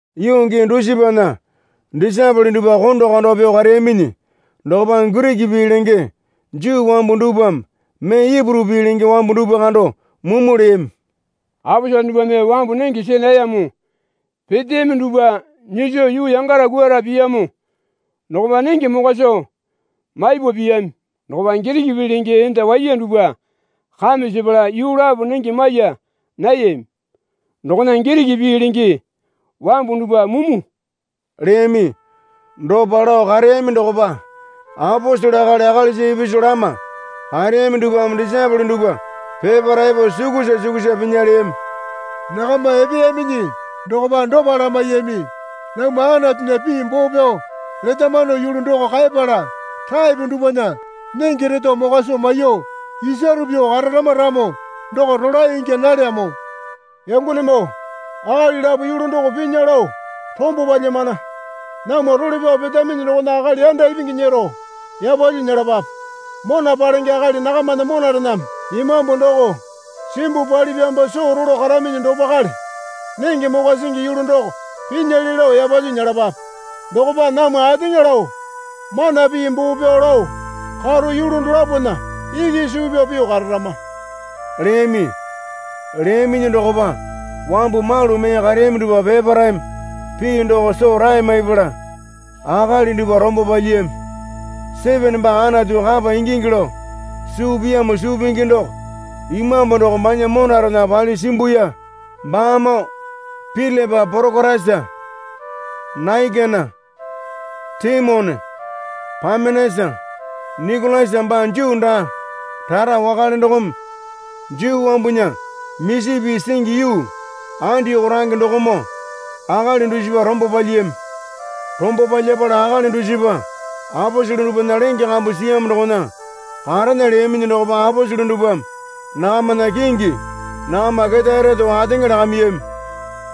Yuu gii dusipana disaepole dupwa konda konda pyuo kareyaminyi dokopa Giriki pii lenge Juu wambu dupwame mee Ipuru pii lenge wambu dupwa kando mumu leyami. Aposele dupwame wambu nenge see nayamo peteyami dupwa nyiso yuu yangara kwuara piyamo dokopa nenge mokwa soo maipa piyami dokopa Giriki pii lenge enda waiya dupwa kame sepala yuu lapo nenge maiya nayami dokona Giriki pii lenge wambu dupwa mumu leyami. Dopa lao kareyami dokopa aposele akali akalisa ipisu lama kareyami dupwame disaepole dupwa peparae epo sukusa sukusa pinya leyami. Nakama epeyaminyi dokopa dopa lamaiyami. Namwa Anatunya pii boo pyao letamano yulu doko kaepala taepo dupwana nenge reto mokwa soo maiyuo isaro pyuo kararama ramo doko rolae ingya nalyamo. Yangonemoo, akali lapo yulu doko pinya lao rombo palyamana. Namwa role pyao petaminyi dokona akali yanda ipingi nyero yapalyuo nyelapape. Mona palenge akali nakamana monarename Imambu doko simbuo palipyamopa soo rolo karaminyi dopakale nenge mokwa singi yulu doko pinyale lao yapalyuo nyelapape. Dokopa namwa ateŋa lao mana pii boo pyao lao karo yulu dolapona iki suu pyao pyuo kararama leyami. Leyaminyi dokopa wambu malu mee kareyami dupwa peparaeme pii doko soo rae maipala akali dupwa rombo palyiyami. Sitipena baa Anatu kapa ingingi lao suu piyamo suu pingi doko Imambu doko banya monarena palyuo simbuya baamoo Pilipa Porokorasa Naikena Taimone Pamenasa Nikolasa baa Juu daa rara wakale dokome Juu wambunya misi pii singi yuu Andioko range dokomoo akali dusipa rombo palyiyami. Rombo palyapala akali dusipa aposele dupwana lenge kambu siyamo dokona karena leyaminyi dokopa aposele dupwame nakamana kingi nakama ketae reto ateŋa lakamiyami.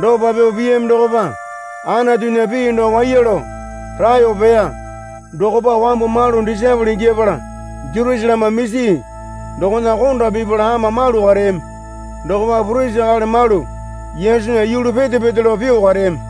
Dopa pyuo piyami dokopa Anatunya pii doko waiya lao raeyo peya. Dokopa wambu malu disaepole ingyapala Jerusaleme misi dokona konda pipala ama malu kareyami. Dokopa purisi akali malu Yesunya yulu pete pete lao pyuo kareyami.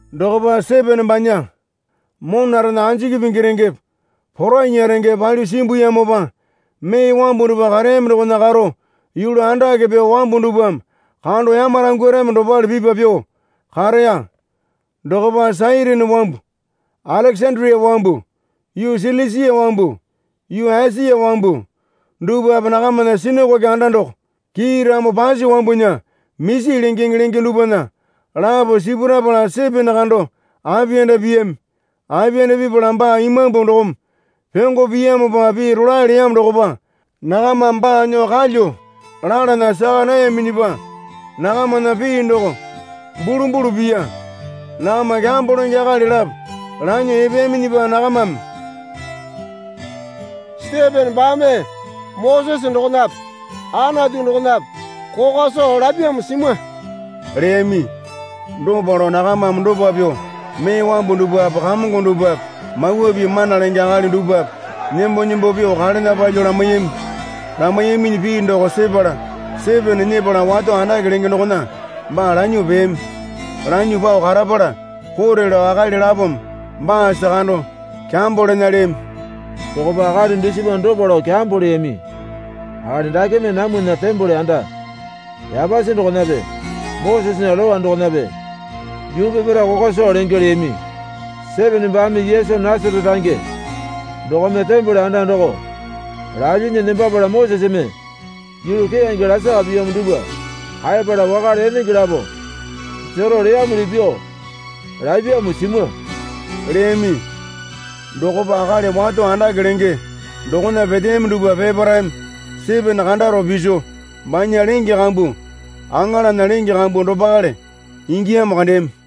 Dokopa Sitipena banya monarena anjiki pingi rengepe porainya rengepe palyuo simbuyamopa mee wambu dupwa kareyami dokona karo yulu andake pyuo wambu dupwame kando yamarangwarami dopale pipa pyuo kareya. Dokopa Sairini wambu Alekesandia wambu yuu Silisia wambu yuu Esia wambu dupwape nakamana sinakoke anda doko Kiiramo Pasi Wambunya Misi Lengeŋe lenge dupwana lapo sipurapala Sitipena kando apiyanda piyami. Apiyanda pipala baa Imambu dokome pyongo piyamopa pii rolae leyamo dokopa nakamame baa nyuo kalyuo lalana saka nayaminyipa nakamana pii doko bulumbulu piya. Nakama kyambo lenge akali lapo lanyuo epeyaminyipa nakamame Sitipena baame Mosese dokonape Anatu dokonape kokwa soo lapyamo simwa leyami. Dopa lao nakamame dopa pyuo mee wambu dupwape kamongo dupwape Mawa Pii mana lenge akali dupwape nembo nembo pyuo kalena palyuo lamaiyami. Lamaiyaminyi pii doko sepala Sitipena nyepala wato andake lenge dokona baa lanyuo peyami. Lanyuo pao karapala kote lao akali lapome baasa kando kyambo lena leyami. Dokopa akali dusipa dopa lao kyambo leyami. Akali dakeme namwana tembole anda yapasi dokonape Mosesena Lowa dokonape yuu peparae kokwa soo lenge leyami. Sitipena baame Yesu Nasarete range dokome tembole anda doko lalyinyi nembapala Moseseme yulu keyange lasaka piyamo dupwa kaepala wakale enenge lapo jero leyamuli pyuo lapyamo simwa leyami. Dokopa akali wato andake lenge dokona peteyami dupwa peparaeme Sitipena kandaro piso banya lenge kambu aŋalana lenge kambu dopakale ingiyamo kandeyami.